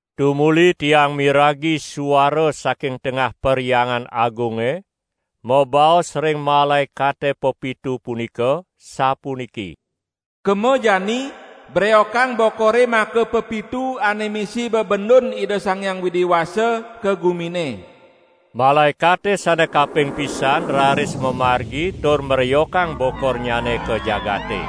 Tumuli tiang miragi suara saking tengah Perhyangan Agunge mabaos ring malaekate pepitu punika sapuniki: "Kema jani breokang bokore makapepitu ane misi bebendun Ida Sang Hyang Widi Wasa ka gumine." Malaekate sane kaping pisan raris mamargi tur mreokang bokornyane ka jagate.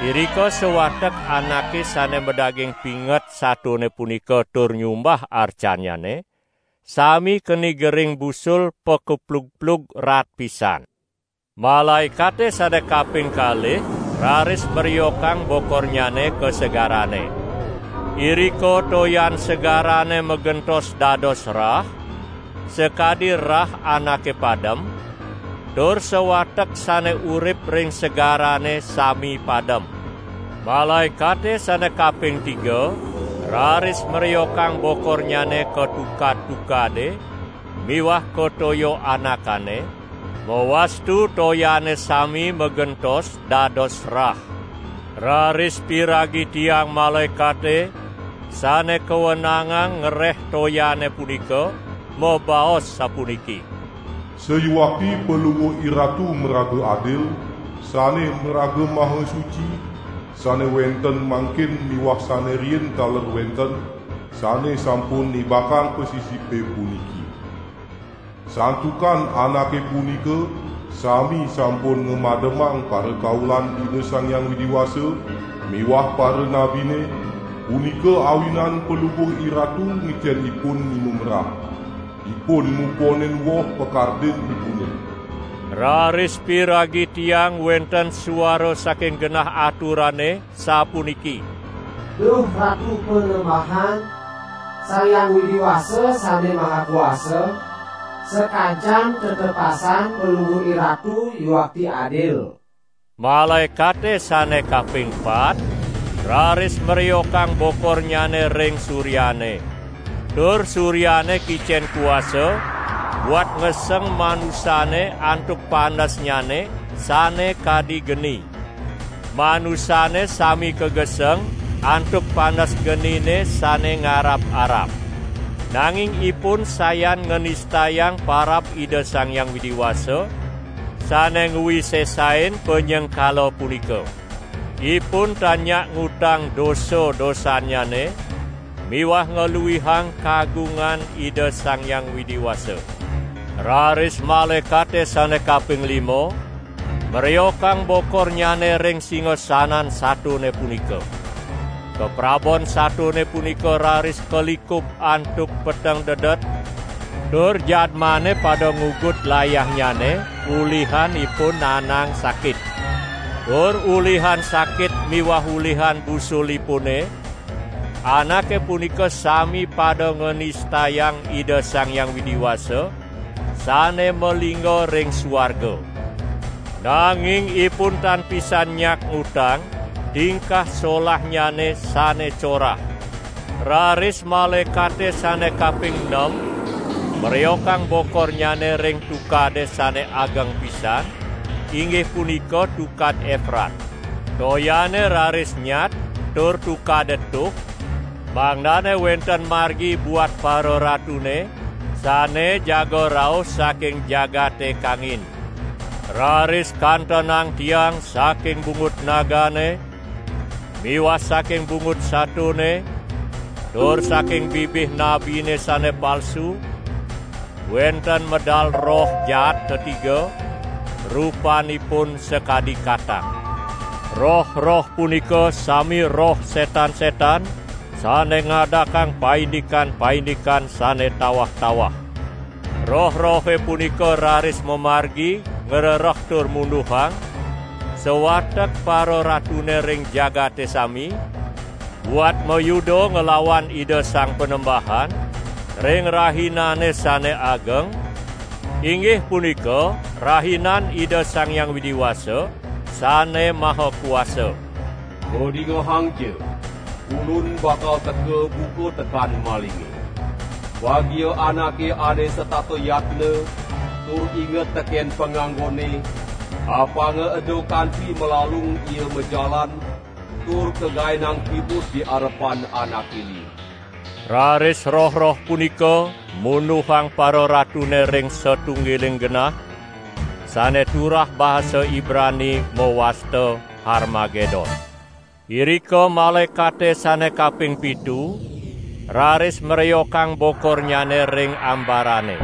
Irika sawatek anake sane madaging pinget satone punika tur nyumbah arcannyane, sami keni gering busul pakeplugplug raat pisan. Malaekate sane kaping kalih raris mreokang bokornyane ka segarane. Irika toyan segarane magentos dados rah sakadi rah anake padem, tur sawatek sane urip ring segarane sami padem. Malaekate sane kaping tiga raris mreokang bokornyane ka tukad-tukade miwah ka toya anakane, mawastu toyane sami magentos dados rah. Raris piragi tiang malaekate sane kawenangang ngereh toyane punika mabaos sapuniki: "Sayuakti Palungguh IRatu maraga adil, sane maraga maha suci, sane wenten mangkin miwah sane riin taler wenten, sane sampun nibakang pasisipe puniki! Santukan anake punika sami sampun ngamademang parakaulan Ida Sang Hyang Widi Wasa miwah paranabine, punika awinan Palungguh IRatu ngicen ipun nginum rah. Ipun muponin woh pakardinipune!" Raris piragi tiang wenten suara saking genah aturane sapuniki: "Duh Ratu Panembahan, Sang Hyang Widi Wasa Sane Maha Kuasa, sakancan tetepasan Palungguh IRatu yuakti adil!" Malaekate sane kaping pat raris mreokang bokornyane ring suryane, tur suryane kicen kuasa buat ngeseng manusane antuk panesnyane sane kadi geni. Manusane sami kageseng antuk panes genine sane ngarab-arab. Nanging ipun sayan nganistayang parab Ida Sang Hyang Widi Wasa sane ngwisesain panyengkala punika. Ipun tan nyak ngutang dosa-dosannyane miwah ngluihang kagungan Ida Sang Hyang Widi Wasa. Raris malaekate sane kaping lima mreokang bokornyane ring singasanan satone punika. Kaprabon satone punika raris kalikub antuk peteng dedet, tur jadmane pada ngugut layahnyane ulihan ipun naenang sakit. Tur ulihan sakit miwah ulihan busulipune, anake punika sami pada nganistayang Ida Sang Hyang Widi Wasa sane malingga ring suarga. Nanging ipun tan pisan nyak ngutang tingkah solahnyane sane corah. Raris malaekate sane kaping nem mreokang bokornyane ring tukade sane ageng pisan, inggih punika Tukad Eprat. Toyane raris nyat tur tukade tuh, mangdane wenten margi buat pararatune sane jaga rauh saking jagate kangin. Raris kantenang tiang saking bungut nagane miwah saking bungut satone tur saking bibih nabine sane palsu wenten medal roh jaat tetiga, rupanipun sakadi katak. Roh-roh punika sami roh setan-setan sane ngadakang paindikan-paindikan sane tawah-tawah. Roh-rohe punika raris mamargi ngrereh tur munduhang sawatek pararatune ring jagate sami, buat mayuda nglawan Ida Sang Panembahan ring rahinane sane ageng, inggih punika Rahinan Ida Sang Hyang Widi Wasa Sane Maha Kuasa. "Padingehangja! Ulun bakal teka buka tekan malinge. Bagia anake ane setata yatna tur inget teken panganggonne, apanga eda kanti malalung ia majalan tur kagaenang kimud di arepan anake liu!" Raris roh-roh punika munduhang pararatune ring satunggiling genah sane turah basa Ibrani mawasta Harmagedon. Irika malaekate sane kaping pitu raris mreokang bokornyane ring ambarane.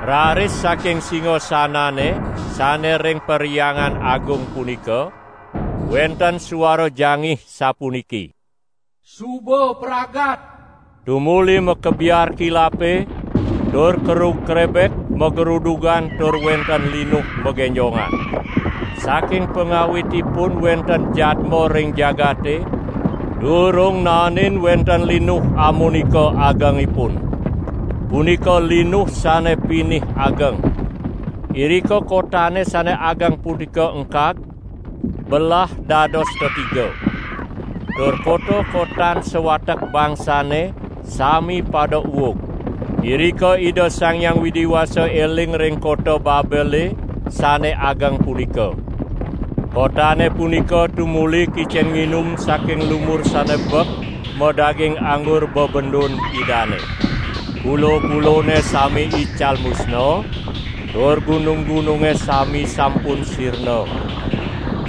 Raris saking singasanane sane ring Perhyangan Agung punika wenten suara jangih sapuniki: "Suba pragat!" Tumuli makebiar kilape tur kerug krebek magrudugan tur wenten linuh magenjongan. Saking pangawitipun wenten jadma ring jagate, durung naenin wenten linuh amunika agengipun. Punika linuh sane pinih ageng. Irika kotane sane ageng punika engkag, belah dados tetiga. Tur kota-kotan sawatek bangsane sami pada uug. Irika Ida Sang Hyang Widi Wasa eling ring kota Babele sane ageng punika. Kotane punika tumuli kicen nginum saking lumur sane bek madaging anggur bebendun Idane. Pulo-pulone sami ical musna, tur gunung-gununge sami sampun sirna.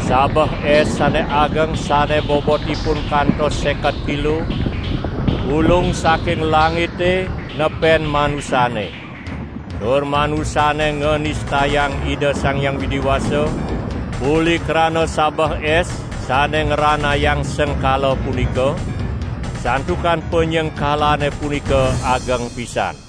Sabeh es sane ageng sane bobotipun kantos seket kilo, ulung saking langite nepen manusane. Tur manusane nganistayang Ida Sang Hyang Widi Wasa uli krana sabeh es sane ngranayang sengkala punika, santukan panyengkalane punika ageng pisan.